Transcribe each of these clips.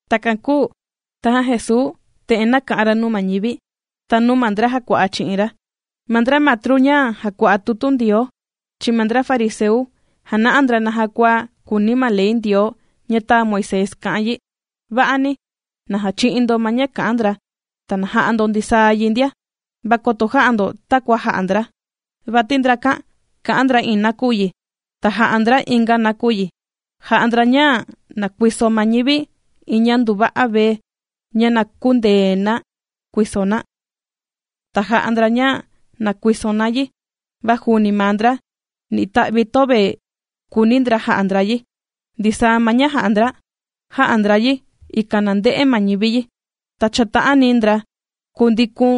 Takan kūu tajan Jesuu, te'en nāka'an ra nuu ma ñivi, ta nuu ma ndra jàkua'a chi'in ra: ―Ma ndra matru ña jàkua'a tutu Ndioo, chi'in ma ndra fariseu jàna'a ndra naja kua kùuni ma ley Ndioo ña tāa Moisés ka'an yi. Va'ani, na jachi'in ndo ma ña kà'an ndra, ta na ja'a ndo ndisaa yi ndia, va koto jä'a ndo takua jà'a ndra, vati ndrakan kà'an ndra iin nakuyi, ta jà'a ndra inga nakuyi. Jà'a ndra ña na kuiso ma ñivi iin ña nduva'a vee, ña na kündee na kuiso na, ta jà'a ndra ña na kuiso na yi, va juuni maa ndra, ni ita'vi töve kùuni ndra ja'a ndra yi. Ndisaa ma ña jà'a ndra, jà'a ndra yi ikan na nde'e ma ñivi yi. Ta chàta'ani ndra kundikun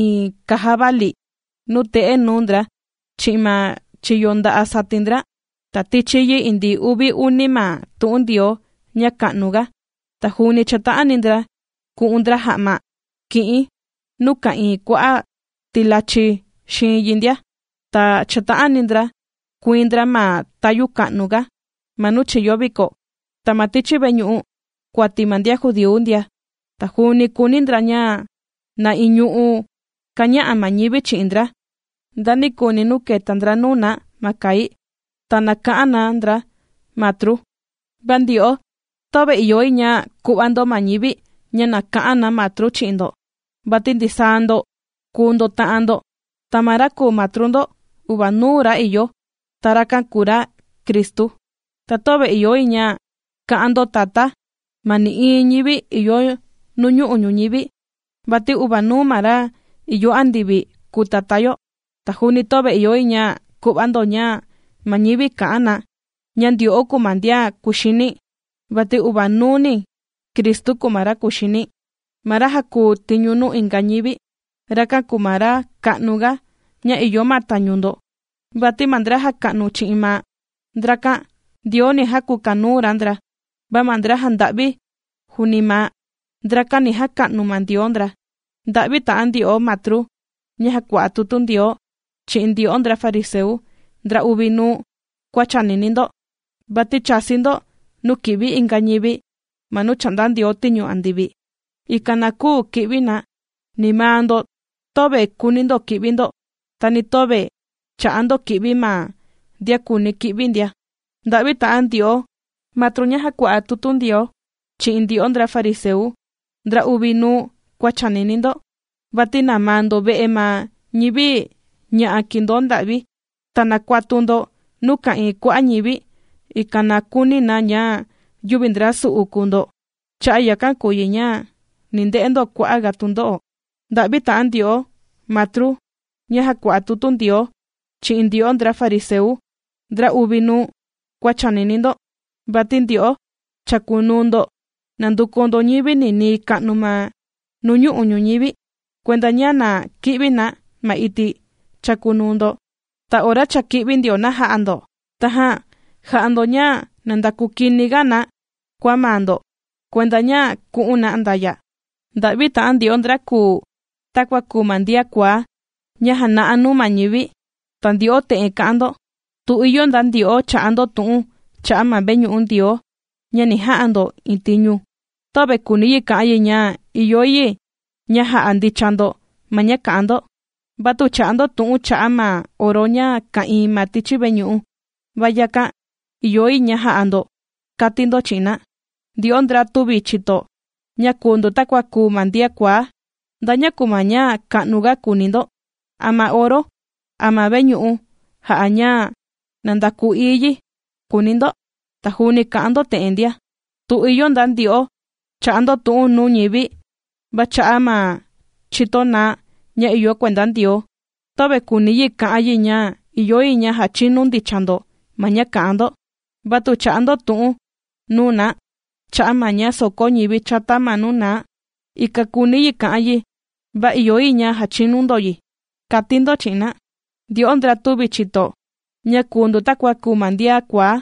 iin kaja vali, nuu te'e nuu ndra chi'in ma chiyo nda'a' satin ndra, ta tichi yi indii uvi uni ma tu'un Ndioo ña ka'nu ga. Ta juuni chàta'ani ndra kù'un ndra ja'ma ki'in nuu ka'ìin kua'a' tilachi xiin yi ndia. Ta chàta'ani ndra kuiin ndra ma tayu ka'nu ga ma nuu chìyo viko, ta ma tichi veñu'u kuati ma ndian judíu ndia. Ta juuni kùuni ndra ña na iñu'u kaña'a ma ñivi chi'in ndra ndanikuni nuu kèta ndra nuu na ma kai. Ta na ka'an na ndra, “matru.” ’Va ndyo'o, töve ìyo yi ña ku'va ndo ma ñivi ña na ka'an na, matru chi'in ndo, vati ndisaa ndo kùu ndo ta'an ndo. Ta ma ra kùu Matru ndo, uvanuuni ra ìyo, ta rakan kùu ra, Cristu. Ta töve ìyo yi ña ka'an ndo, tatá, ma nï'iin ñivi ìyo nuñu'u' ñuñivi, vati uvanuuni ma ra ìyo andivi kùu Tatá yo. Ta juuni töve ìyo yi ña ku'va ndo ña ma ñivi ka'an na, ña ndyo'o kuu ma ndian kuxini, vati uvanuuni Cristu kùu ma ra kuxini. Ma ra jàkuu tiñu nuu inga ñivi, rakan kùu ma ra ka'nu ga ña ìyo ma tañu ndo. Vati ma ndra jàka'nu chi'in maa', ndrakan, Ndioo ni jakukanuu ra ndra, va ma ndra jànda'vi ña'a juuni maa', ndrakan ni jaka'nu ma Ndioo ndra. ’¡Nda'vi ta'an ndyo'o, matru ña jàkua'a tutu Ndioo, chi'in ndyo'o ndra fariseu ndra uvi nuu kua chànini ndo! Vati chàsi ndo nuu kì'vi inga ñivi ma nuu chà'nda Ndioo tiñu andivi, ikan na küu ki'vi na. Ni maa ndo töve kùuni ndo ki'vi ndo, ta ni töve chà'a ndo ki'vi ma ndian kùuni ki'vi ndia. ’¡Nda'vi ta'an ndyo'o, matru ña jàkua'a tutu Ndioo, chi'in ndyo'o ndra fariseu ndra uvi nuu kua chànini ndo! Vati namaa ndo ve'e ma ñivi ña'a kìndoo nda'vi, ta nàkuatu ndo nuu ka'ìin kua'a' ñivi, ikan na kuuni na ña yüvi ndra su'u kùu ndo. Cha'a' yakan kùu yi ña ni nde'e ndo kua'a' ga tundo'o. ’¡Nda'vi ta'an ndyo'o, matru ña jàkua'a tutu Ndioo, chi'in ndyo'o ndra fariseu ndra uvi nuu kua chànini ndo! Vati ndyo'o chàkunuu ndo nànduku ndo ñivi ninii ka'nu ma nuñu'u' ñuñivi, kuenda ña na ki'vi na ma iti' chàkunuu ndo. Ta ora cha kī'vi ndio na jā'a ndo, tajan jà'a ndo ña na ndakuu kini ga na kua maa ndo kuenda ña ku'un na andaya'. ’¡Nda'vi ta'an ndyo'o, ndra kùu takua kùu ma ndian kuaá ña jàna'a nuu ma ñivi!, ti ndyo'o te'en kà'an ndo: “Tu ìyo nda ndyo'o, chà'a ndo tu'un cha'a' ma veñu'u Ndioo ña ni ja'a ndo iin tiñu, töve kùuni yi ka'an yi ña ìyo yi ña ja'a ndicha ndo ma ña kà'an ndo. Va tu chà'a ndo tu'un cha'a' ma oro ña ka'ìin ma tichi veñu'u, va yakan, ìyo yi ña ja'a ndo”, kàti ndo chi'in na. ¡Ndyo'o ndra tüvi chìto, ña kùu ndo takua kùu ma ndian kuaá! ¿Nda ña kùu ma ña ka'nu ga kùuni ndo: a ma oro, a ma veñu'u jà'a ña na ndakuu ií yi?, kùuni ndo. Ta juuni kà'an ndo te'en ndia: “Tu ìyo nda ndyo'o, chà'a ndo tu'un nuu ñivi va cha'a' ma chito naá ña ìyo kuenda Ndioo, töve kùuni yi ka'an yi ña ìyo yi ña jàchinu ndicha ndo ma ña kà'an ndo. Va tu chà'a ndo tu'un nuu na cha'a' ma ña soko ñivi chata ma nuu naa, ikan kuuni yi ka'an yi, va ìyo yi ña jachinu ndo yi”, kàti ndo chi'in na. ¡Ndyo'o ndra tüvi chìto, ña kùu ndo takua kùu ma ndian kuaá!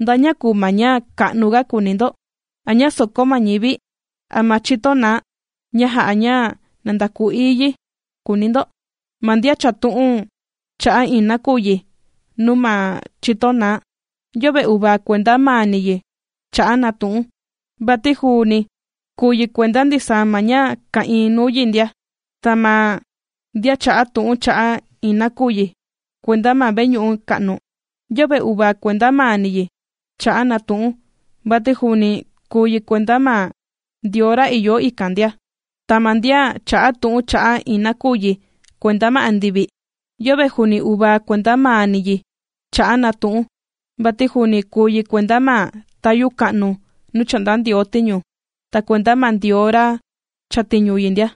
¿Nda ña kùu ma ña ka'nu ga kùuni ndo: a ña sòkó ma ñivi, a ma chito naá ña jà'a ña na ndakuu ií yi?, kùuni ndo. Ma ndian chà'a tu'un cha'a' iin nakuyi nuu ma chito naá, yöve uvaa kuenda maani yi chà'a na tu'un, vati juuni kùu yi kuenda ndisaa ma ña ka'ìin nuu yi ndia. Ta ma ndian chà'a tu'un cha'a' iin nakuyi kuenda ma veñu'u ka'nu, yöve uvaa kuenda maani yi chà'a na tu'un, vati juuni kùu yi kuenda ma Ndioo ra ìyo ikan ndia. Ta ma ndian chà'a tu'un cha'a' iin nakuyi kuenda ma andivi, yöve juuni uvaa kuenda maani yi chà'a na tu'un, vati juuni kùu yi kuenda ma tayu ka'nu nuu chà'nda Ndioo tiñu, ta kuenda ma Ndioo ra chàtiñu yi ndia.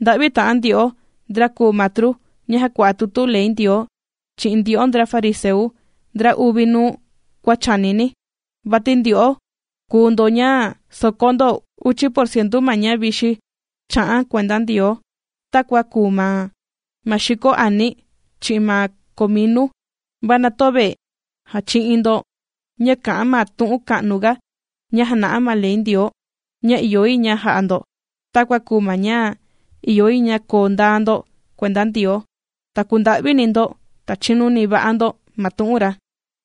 ’¡Nda'vi ta'an ndyo'o, ndra kùu matru ña jàkua'a tutu ley Ndioo, chi'in ndyo'o ndra fariseu ndra uvi nuu kua chànini! Vati ndyo'o kùu ndo ña sokó ndo uchi porcientu ma ña vixi chà'an kuenda Ndioo, takua kùu ma xiko ani, chi'in ma cominu, va na töve jàchi'in ndo ña kà'an ma tu'un ka'nu ga ña jàna'a ma ley Ndioo, ña ìyo yi ña ja'a ndo, takua kùu ma ña, ìyo yi ña koo ndaa ndo kuenda Ndioo, ta kunda'vini ndo, ta chinuni va'a ndo ma tu'un ra.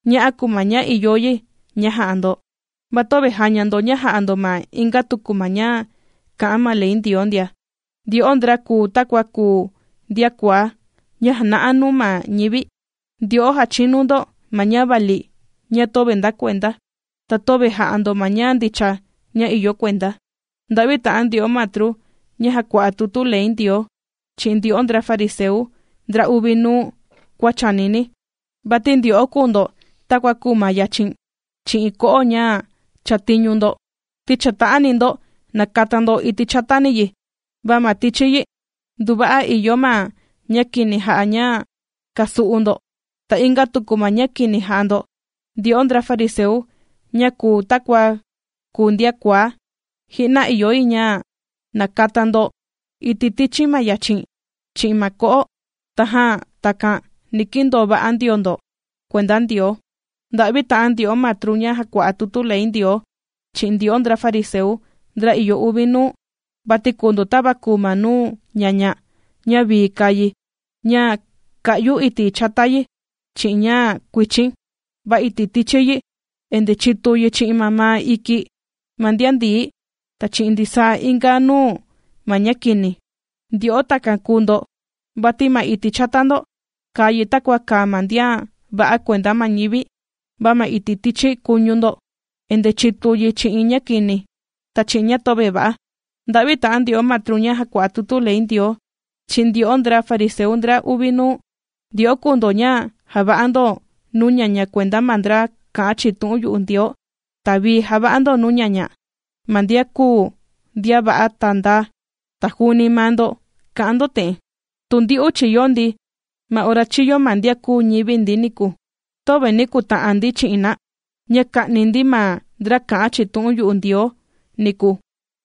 Ña'a kùu ma ña ìyo yi ña ja'a ndo, ta töve jàña ndo ña jà'a ndo ma inga tuku ma ña kà'an ma Ley Ndioo ndia. ¡Ndyo'o ndra kùu takua kùu ndian kuaá ña jàna'a nuu ma ñivi, ndyo'o jàchinu ndo ma ña vali ña töve ndakuenda, ta töve jà'a ndo ma ña ndicha ña ìyo kuenda! ’¡Nda'vi ta'an ndyo'o matru ña jàkua'a tutu ley Ndioo, chi'in ndyo'o ndra fariseu ndra uvi nuu kua chànini! Vati ndyo'o kùu ndo takua kùu ma yachin, chi'in ko'o ña chàtiñu ndo, ti chàta'ani ndo nakata ndo iti' chatani yi, va ma tichi yi, nduva'a ìyo ma ña kini jà'a ña kasu'u ndo, ta inga tuku ma ña kini jà'a ndo. ¡Ndyo'o ndra fariseu ña kùu takua kùu ndian kuaá: ji'na ìyo yi ña nakata ndo iti' tichi ma yachin, chi'in ma ko'o, tajan takan, ni kindoo va'a ndio ndo kuenda Ndioo! ’¡Nda'vi ta'an ndyo'o matru ña jàkua'a tutu ley Ndioo, chi'in ndyo'o ndra fariseu ndra ìyo uvi nuu! Vati kùu ndo tava kùu ma nuu ñaña, ña vii kàa yi ña kā'yu iti' chata yi chi'in ña kuichin, va iti' tichi yi endee chitu yi chi'in mamaa iki ma ndian ndií, ta chi'in ndisaa inga nuu ma ña kini. Ndyo'o takan kùu ndo, vati ma iti' chata ndo, kàa yi takua kàa ma ndian va'a kuenda ma ñivi, va ma iti' tichi kuñu ndo endee chìtu yi chi'in ña kini, ta chi'in ña töve va'a. ’¡Nda'vi ta'an ndyo'o matru ña jàkua'a tutu ley Ndioo, chi'in ndyo'o ndra fariseu ndra uvi nuu! Ndyo'o kùu ndo ña jàva'a ndo nuu ñaña kuenda ma ndra kā'an chi'in tu'un yu'u Ndioo, ta vii jàva'a ndo nuu ñaña ma ndian kūu ndian va'a ta ndaa. Ta juuni maa ndo kà'an ndo te'en: “Tu ndyu'u chīyo ndi ma ora chīyo ma ndian kūu ñivi ndi niku, töve ni kuta'an ndi chi'in na, ña ka'ni ndi ma ndra kā'an chi'in tu'un yu'u Ndioo niku”,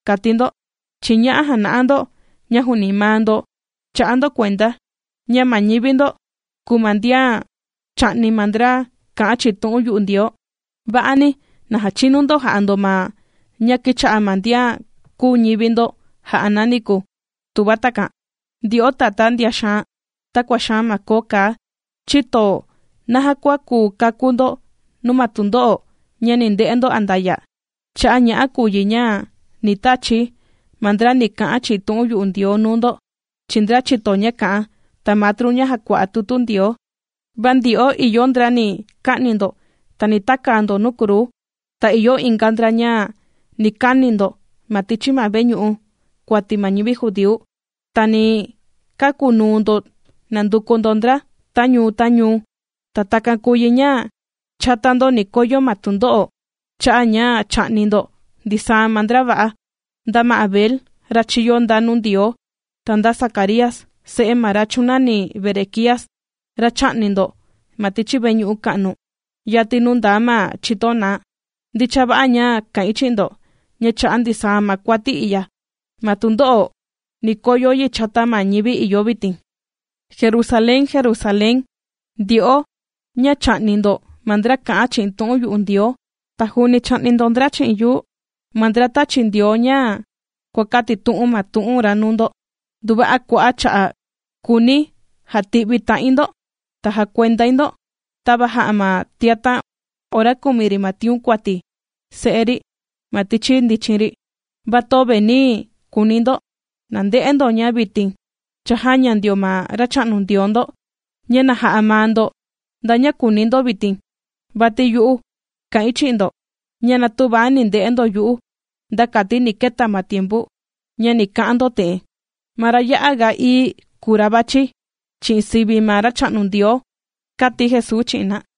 kàti ndo. Chi'in ña'a jàna'a ndo, ña juuni maa ndo chà'a ndo kuenda, ña ma ñivi ndo kùu ma ndian chà'ni ma ndra kā'an chi'in tu'un yu'u Ndioo. ¡Va'ani, na jachinu ndo jà'a ndo ma ña kīcha'a ma ndian kūu ñivi ndo jà'a na niku, tuva takan! ’¡Ndyo'o tatá ndian xaan, takua xaan ma koo kaa! ¿Chïto naja kua kùu kakú ndo nuu ma tundo'o ña ni nde'e ndo andaya'? Cha'a' ña'a kùu yi ña ni tachi̱ ma ndra ni ka'an chi'in tu'un yu'u Ndioo nuu ndo, chi'in ndra chìto ña kà'an, ta matru ña jàkua'a tutu Ndioo. Va ndyo'o, ìyo ndra ni ka'ni ndo, ta ni takaa ndo nuu kruu, ta ìyo inga ndra ña ni kani ndo ma tichi ma veñu'u kuati ma ñivi judíu, ta ni kakunuu ndo nànduku ndo ndra, ta ñuu, ta ñuu. Ta takan kùu yi ña, chata ndo ni koyo ma tundo'o, cha'a' ña chā'ni ndo ndisaa ma ndra va'a, nda ma Abel, ra chīyo ndaa nuu Ndioo, ta nda Zacaría, se'e ma ra chūnani Berequías, ra chā'ni ndo ma tichi veñu'u ka'nu, yati nuu ndaa ma chito naá. Ndicha va'a ña kà'in chi'in ndo, ña cha'a' ndisaa ma kuati i'ya, ma tundo'o ni koyo yi chata ma ñivi ìyo vitin. ’¡Jerusalén, Jerusalén, ndyo'o ña chà'ni ndo ma ndra kà'an chi'in tu'un yu'u Ndioo, ta juuni chà'ni ndo chi'in yuu, ma ndra tàchi Ndioo ña kuàkatitu'un ma tu'un ra nuu ndo! ¡Nduva'a kua'a' cha'a' kūuni̱ jati'vi ta'in ndo, ta jakuendai ndo, tava jà'a ma tiatan' ora kumi ri ma tiun kuati se'e ri ma tichi ndichin ri, va töve nī kuuni ndo! Na nde'e ndo, ña vitin, cha jāña ndio ma Racha'nu Ndioo ndo ña na ja'a maa ndo nda ña kùuni ndo vitin. Vati yu'u kà'in chi'in ndo, ña na tüva ni nde'e ndo yu'u, nda kati ni keta ma tiempu, ña ni ka'an ndo te'en: “Ma ra ya'a ga ií kùu ma ra vàchi, chi'in sivi ma Racha'nu Ndioo”, kàti Jesuu chi'in na.